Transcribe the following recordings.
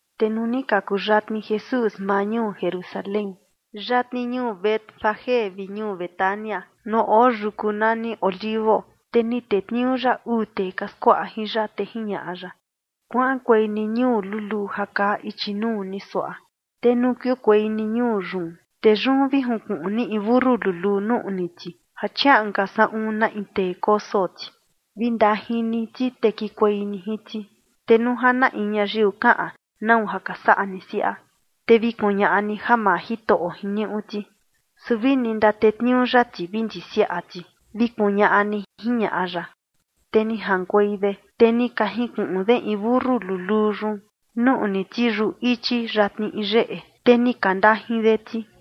Te nuu ni ka kuyatni Jesús maa ñuu Jerusalén, yatni ñuu Betfagé vi ñuu Betania, nuu oo yuku nani Olivo, te ni tetniuu ya uu tee ka skuaꞌa jin ya, te jiñaꞌa ya: ―Kuaꞌankuei ni ñuu luluu ja kaa ichi nuu ni suaꞌa, te nuu kiukuei ni ñuu yun, te yun vi junkuꞌun ni in mentu luluu nuꞌni ti, ja chiaꞌan ka saꞌun na in tee koso ti. Vi ndajin ni ti, te kikuei ni jin ti. Te nuu ja na in ñayiu kaꞌan: “¿Nau ja ka saꞌa ni siaꞌa?” Te vi kuñaꞌa ni ja maa Jitoꞌo jiniuꞌu ti, su vini ndatetniuu ya ti vi ndisiaꞌa ti, vi kuñaꞌa ni ―jiñaꞌa ya. Te ni jaꞌankuei de, te ni ka junkuꞌun de in mentu luluu yun nuꞌni ti yuꞌu ichi yatni in yeꞌe, te ni ka ndajin de ti.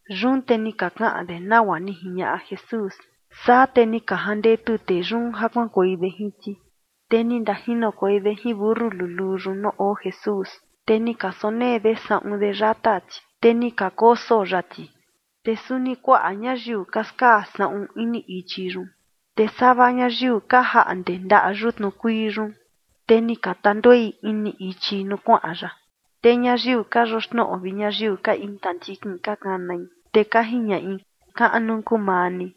Yun te ni ka kaꞌan de nagua ni jiñaꞌa Jesús. Saa te ni ka jandetu tee yun ja kuaꞌankuei de jin ti. Te ni ndajinokuei de jin mentu luluu yun nuu oo Jesús, te ni ka sonee de saꞌun de yata ti, te ni kakoso ya ti. Te suni kuaꞌa ñayiu ka skaa saꞌun ini ichi yun, te sava ñayiu ka jaꞌnde ndaꞌa yutnu kuii yun, te ni ka tanduei ini ichi nuu kuaꞌan ya. Te ñayiu ka yoxnoꞌo vi ñayiu ka intandikin ka kanai, te ka jiñaꞌi: ―¡Kaꞌnu kuu maa ni!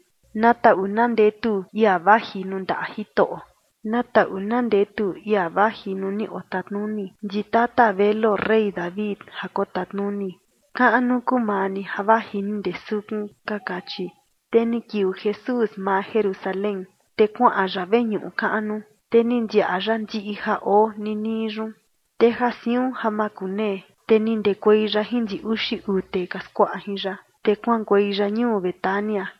¡Na taꞌu na ndetu ia vaji nuu ndaꞌa Jitoꞌo! Na taꞌu na ndetu ia vaji nuu ni otatnuni ndi tata veluo rey David ja kotatnuni. Kaꞌnu kuu maa ni ja vaji ni ndee sukun ―ka kachi. Te ni kiuu Jesús maa Jerusalén, te kuaꞌan ya veñuꞌu kaꞌnu, te ni ndiaꞌa ya ndiꞌi ja oo ninii yun. Te ja siun ja makunee, te ni ndekuei ya jin ndi uxi uu tee ka skuaꞌa jin ya, te kuaꞌankuei ya ñuu Betania.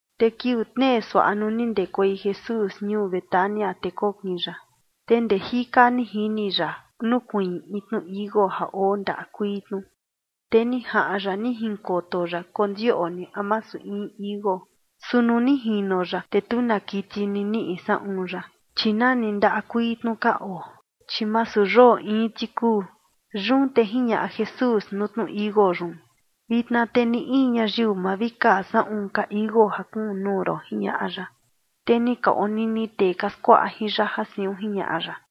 Te kiuu tnee suaꞌa, nuu ni ndekuei Jesús ñuu Betania, te kokin ya. Te ndee jika ni jini ya nukuiin in tnu tichi iuu ja oo ndaꞌa kuii tnu, te ni jaꞌan ya ni jinkoto ya kondioꞌni a masu in tichi iuu. Su nuu ni jino ya, te tu na kiti ni niꞌi saꞌun ya, chi nani ndaꞌa kuii tnu ka oo, chi masu yoo iin ti kuu. Yun te jiñaꞌa Jesús nuu tnu tichi iuu yun: ―Vitna te ni in ñayiu ma vi kaa saꞌun ka tichi iuu ja kuun nuu ron ―jiñaꞌa ya. Te ni ka onini tee ka skuaꞌa jin ya ja siun jiñaꞌa ya.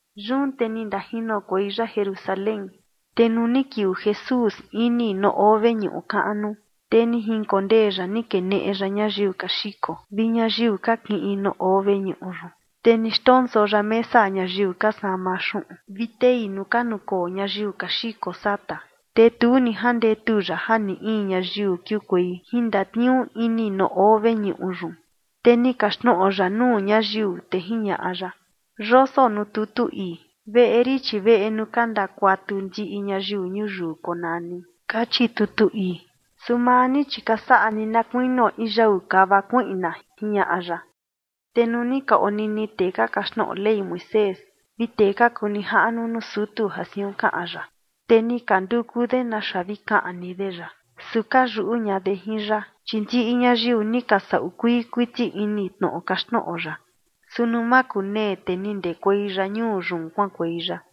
Yun te ni ndajinokuei ya Jerusalén. Te nuu ni kiuu Jesús ini nuu oo veñuꞌu kaꞌnu, te ni jinkondee ya ni keneꞌe ya ñayiu ka xiko vi ñayiu ka kiꞌin nuu oo veñuꞌu yun, te ni xndonso ya mesa ñayiu ka sama xuꞌun vi tei nuu ka nukoo ñayiu ka xiko sata. Te tu ni jandetu ya ja na in ñayiu kiukuei jin ndatniuu ini nuu oo veñuꞌu yun. Te ni kaxtnoꞌo ya nuu ñayiu, te jiñaꞌa ya: ―Yoso nuu tutu ii: “Veꞌe rin, chi veꞌe nuu ka ndakuatu ndiꞌi ñayiu ñuyiu konani”, kachi tutu ii. Su maa ni, chi ka saꞌa ni na kuinio in yau kava kuiꞌna ―jiñaꞌa ya. Te nuu ni ka onini tee ka kaxtnoꞌo Ley Moisés vi tee ka kuu nijaꞌnu nuu sutu ja siun kaꞌan ya, te ni ka nduku de naxa vi kaꞌni de ya. Su ka yuꞌu ña de jin ya, chi ndiꞌi ñayiu ni ka saꞌu kuii kuiti ini tnoꞌo kaxtnoꞌo ya. Su nuu makunee, te ni ndekuei ya ñuu yun kuaꞌankuei ya.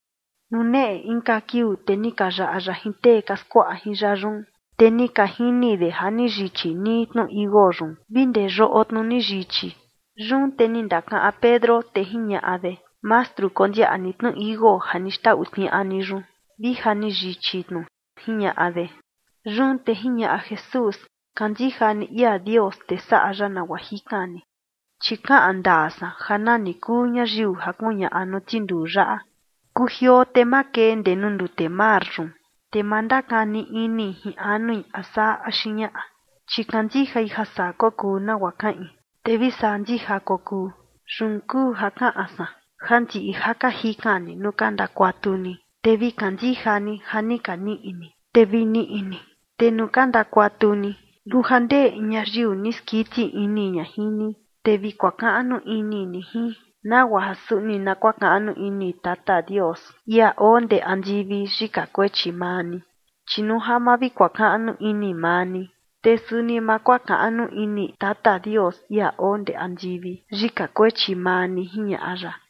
Nuu neꞌe inka kiuu, te ni ka yaꞌa ya jin tee ka skuaꞌa jin ya yun, te ni ka jini de ja ni yichi nii tnu tichi iuu yun vi ndee yoꞌo tnu ni yichi. Yun te ni ndakaꞌan Pedro, te jiñaꞌa de: ―Mastru, kondiaꞌa ni tnu tichi iuu ja ni xtau tniaꞌa ni yun, vi ja ni yichi tnu ―jiñaꞌa de. Yun te jiñaꞌa Jesús: ―Kandija ni ia Dios, te saꞌa ya nagua jikan ni, chi kaꞌan ndaa san ja nani kuu ñayiu ja kuñaꞌa nuu tinduu yaꞌa: “Kujioo te makee ndee nuu ndute mar yun”, te ma ndakani ini jin anui a saa axi ñaꞌa, chi kandijai ja saa kokuu nagua kaꞌin, te vi saa ndija kokuu. Yun kuu ja kaꞌan san, ja ndiꞌi ja ka jikan ni nuu ka ndakuatu ni, te vi kandija ni ja ni ka niꞌi ni, te vi niꞌi ni. Te nuu ka ndakuatu ni, nuu ja ndee in ñayiu ni skiti ini ña jin ni, te vi kuakaꞌnu ini ni jin, nagua ja suni na kuakaꞌnu ini Tata Dios, ia oo ndee andivi, yika kuechi maa ni. Chi nuu ja ma vi kuakaꞌnu ini maa ni, te suni ma kuakaꞌnu ini Tata Dios, ia oo ndee andivi, yika kuechi maa ni ―jiñaꞌa ya.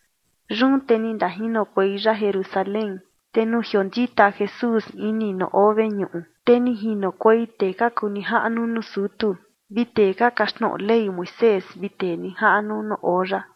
Yun te ni ndajinokuei ya Jerusalén, te nuu jiondita Jesús ini nuu oo veñuꞌu, te ni jinokuei tee ka kuu nijaꞌnu nuu sutu vi tee ka kaxtnoꞌo Ley Moisés vi tee nijaꞌnu nuu oo ya.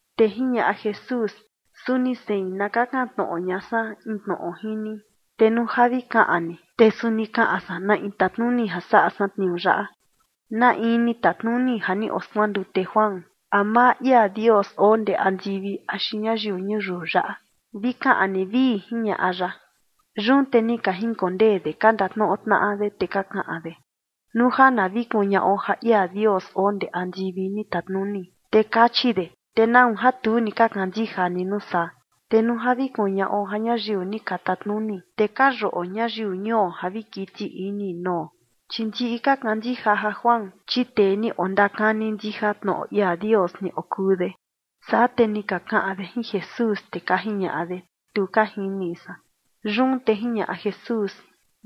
Te jiñaꞌa Jesús: ―Suni sein, na kakan tnoꞌo ña san in tnoꞌo jin ni. Te nuu ja vi kaꞌan ni, te suni kaꞌan san na in tatnuni ja saꞌa san tniuu yaꞌa. ¿Na in ni tatnuni ja ni oskuandute Juan? ¿A maa ia Dios oo ndee andivi axi ñayiu ñuyiu yaꞌa? Vi kaꞌan ni, vii ―jiñaꞌa ya. Yun te ni ka jinkondee de ka ndatnoꞌo tnaꞌa de, te ka kaꞌan de: ―Nuu ja na vi kuñaꞌo ja ia Dios oo ndee andivi ni tatnuni, te kachi de: “¿Te nau ja tu ni ka kandija ni nuu saa?” Te nuu na vi kuñaꞌo ja ñayiu ni ka tatnuni, te ka yuꞌo ñayiu ñuo ja vi kiti ini nuo, chi ndiꞌi ka kandija ja Juan, chi tee ni ondakani ndija tnoꞌo ia Dios ni okuu de. Saa te ni ka kaꞌan de jin Jesús, te ka jiñaꞌa de: ―Tu ka jini san. Yun te jiñaꞌa Jesús: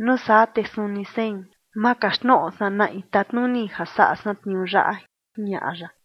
―Nuu saa te suni sein, ma kaxtnoꞌo san na in tatnuni ja saꞌa san tniuu yaꞌa ―jiñaꞌa ya.